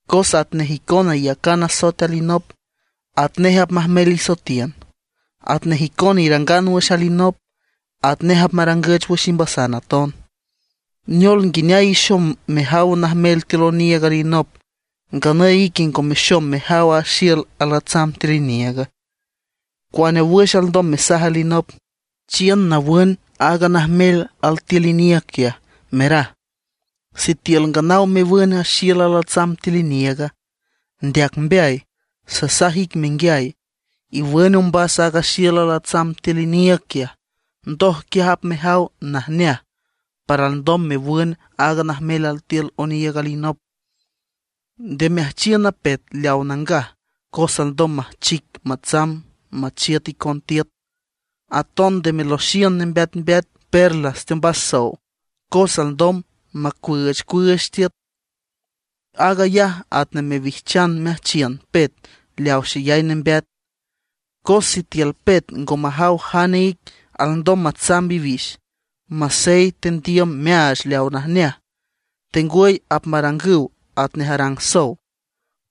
Cos atnej icona iyacan asoet alinop, atnej apmajmel isoetiün. Atnej icona irangan wüx alinop, atnej apmarangüch wüx imbasan aton. ¿Neol nguineay ixom mejaw a najmel altiül oniiüg alinop, nganüy a ique ngo mexom mejaw aaga xiül alatsam tiül iniiüga? ¿Cuane wüx alndom mesaj alinop: “Chiün nawün aaga najmel altiül iniiüg quiaj”, meraj, sitiül nganaw mewün a xiül alatsam tiül iniiüga? ¡Ndeac mbeay! Sasaj ic menguiay, iwün ombas aaga xiül alatsam tiül iniiüg quiaj, ndoj quiaj apmejaw najneaj para alndom mewün aaga najmel altiül oniiüg alinop. ’Nde meajchiün a pet leaw nangaj cos alndom majchic matsamb machiüt icon tiüt. Aton nde meloxiün nembeatmbeat perlas teombas sow, cos alndom macuüüchcuüüch tiüt. Aag ayaj atnej mewijchan meajchiün pet leaw xeyay nembeat. Cos sitiül pet ngo majaw jane ic, alndom matsamb iwix, masey tendiüm meaach leaw najneaj. Tengwüy apmarangüw atnej arang sow,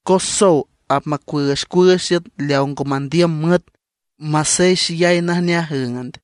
cos sow apmacuüüchcuüüch tiüt leaw ngo mandiüm müet, masey xeyay najneaj üünd.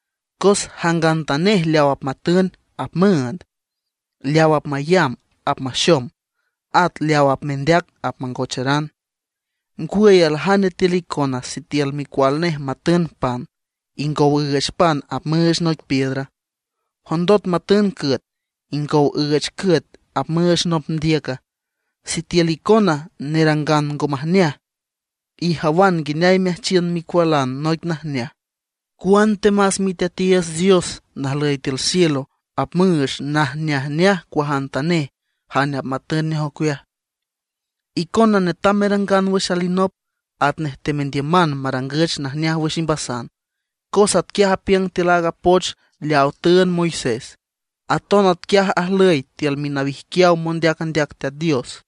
Cos jangantanej leaw apmatün apmüünd; leaw apmayamb apmaxom; at leaw apmendeac apmangocharan. ’¿Ngwüy aljane tiül icona sitiül micual nej matün pan, ingow üüch pan apmüüch noic piedra? ¿Jondot matün cüet, ingow üüch cüet apmüüch nop ndiüca? Sitiül icona nerangan ngo majneaj, ijawan nguineay meajchiün micualan noic najneaj, cuantemas Miteatiiüts Dios najlüy tiül cielo apmüüch najneajneaj cuajantanej jane apmatün nej ocueaj. ’Icona netam merangan wüx alinop atnej temendiüman marangüch najneaj wüx imbasan, cos atquiaj apiüng tiül aaga poch leawa tüünd Moisés. Aton atquiaj ajlüy tiül minawijquiaw mondeac andeac Teat Dios.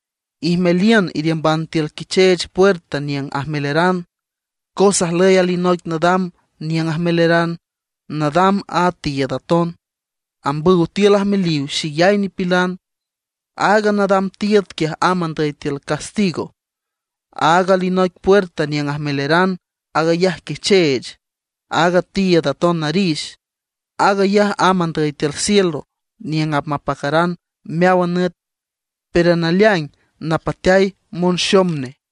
’Ijmeliün iriümban tiül quicheech puerta niüng ajmeleran. Cos ajlüy alinoic nadam niüng ajmeleran, nadam a tiiüd aton, ambüw tiül ajmeliw xeyay nipilan. Aaga nadam tiiüd quiaj amb andüy tiül castigo. Aaga alinoic puerta niüng ajmeleran, aag ayaj quicheech, at a tiiüd aton narix. Aag ayaj amb andüy tiül cielo niüng apmapacaran meáwan nüt, pero naleaing napateay monxom nej.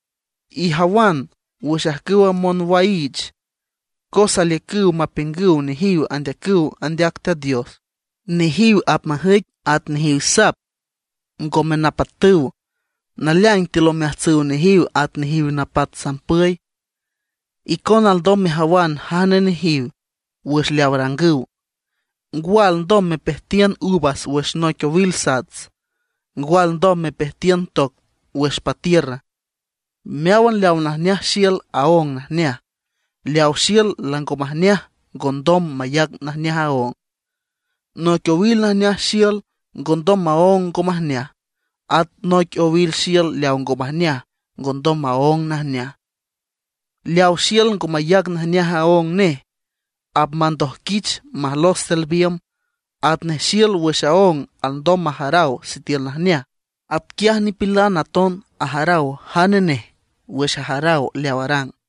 ’Ijawan wüx ajcüwa monwaiich, cos aliücüw mapiüngüw nejiw andeacüw andeac Teat Dios. Nejiw apmajüic at nejiw sap ngome napatüw; naleaing tiül omeajtsüw nejiw at nejiw napat sampüy. Icona alndom mejawan jane nejiw wüx leaw arangüw. ¿Ngwa alndom mepejtiün uvas wüx noic owil sats, ngwa alndom mepejtiün toc wüx patiürra? Meáwan leaw najneaj xiül aóng najneaj, leaw xiül lango majneaj ngondom mayac najneaj aóng. Noic owil najneaj xiül ngondom maóng ngo majneaj, at noic owil xiül leaw ngo majneaj, ngondom maóng najneaj. Leaw xiül ngo mayac najneaj aóng nej, apmandoijquich majlos tiül biümb. Atnej xiül wüx aóng alndom majaraw sitiül najneaj, atquiaj nipilan aton ajaraw jane nej wüx ajaraw leaw arang.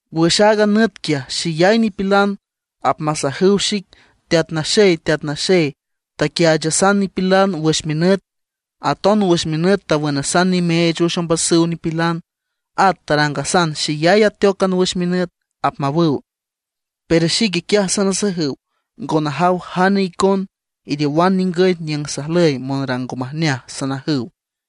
Wüx aaga nüt quiaj xeyay nipilan apmasajüw xic: “Teat Naxey, Teat Naxey, taquiaachasan nipilan wüx minüt, aton wüx minüt tawünasan nimeech wüx ombasüw nipilan. At tarangasan xeyay ateócan wüx minüt”, apmawüw. Pero xique quiaj sanasajüw: “Ngo najaw jane icon. Iriowan ningüy niüng sajlüy monrang ngo majneaj”, sanajüw.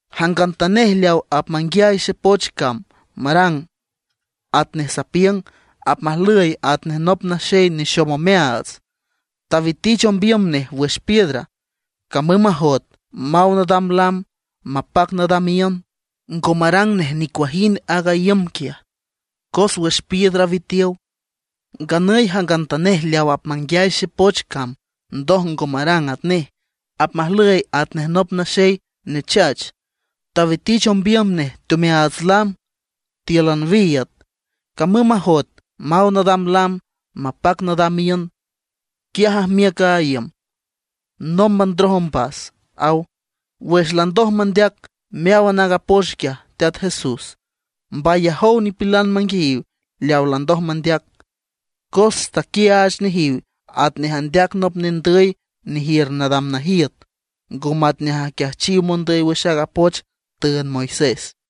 ’Jangantanej leaw apmanguiay xepoch cam marang atnej sapiüng, apmajlüy atnej nop naxey nexom omeaats, tawitich ombiüm nej wüx piedra. Camüm majoet maw nadam lam, mapac nadam iünd, ngo marang nej nicuajind aaga iüm quiaj, cos wüx piedra witiow. Nganüy jangantanej leaw apmanguiay xepoch cam ndoj ngo marang atnej, apmajlüy atnej nop naxey nechach, tawitich ombiüm nej teomeaats lam tíülan wiiüd. Camüm majoet maw nadam lam, mapac nadam iünd, quiaj ajmiüc a iüm. ¡Nómban ndroj ombas! ―aw. Wüx landoj mandeac meáwan aaga poch quiaj Teat Jesús, mbayajow nipilan manguiayiw leaw landoj mandeac. Cos taquiaach nejiw atnej andeac nop nendüy nejiür nadam najiüt, ngo matnej aquiajchiw mondüy wüx aaga poch tüünd Moisés.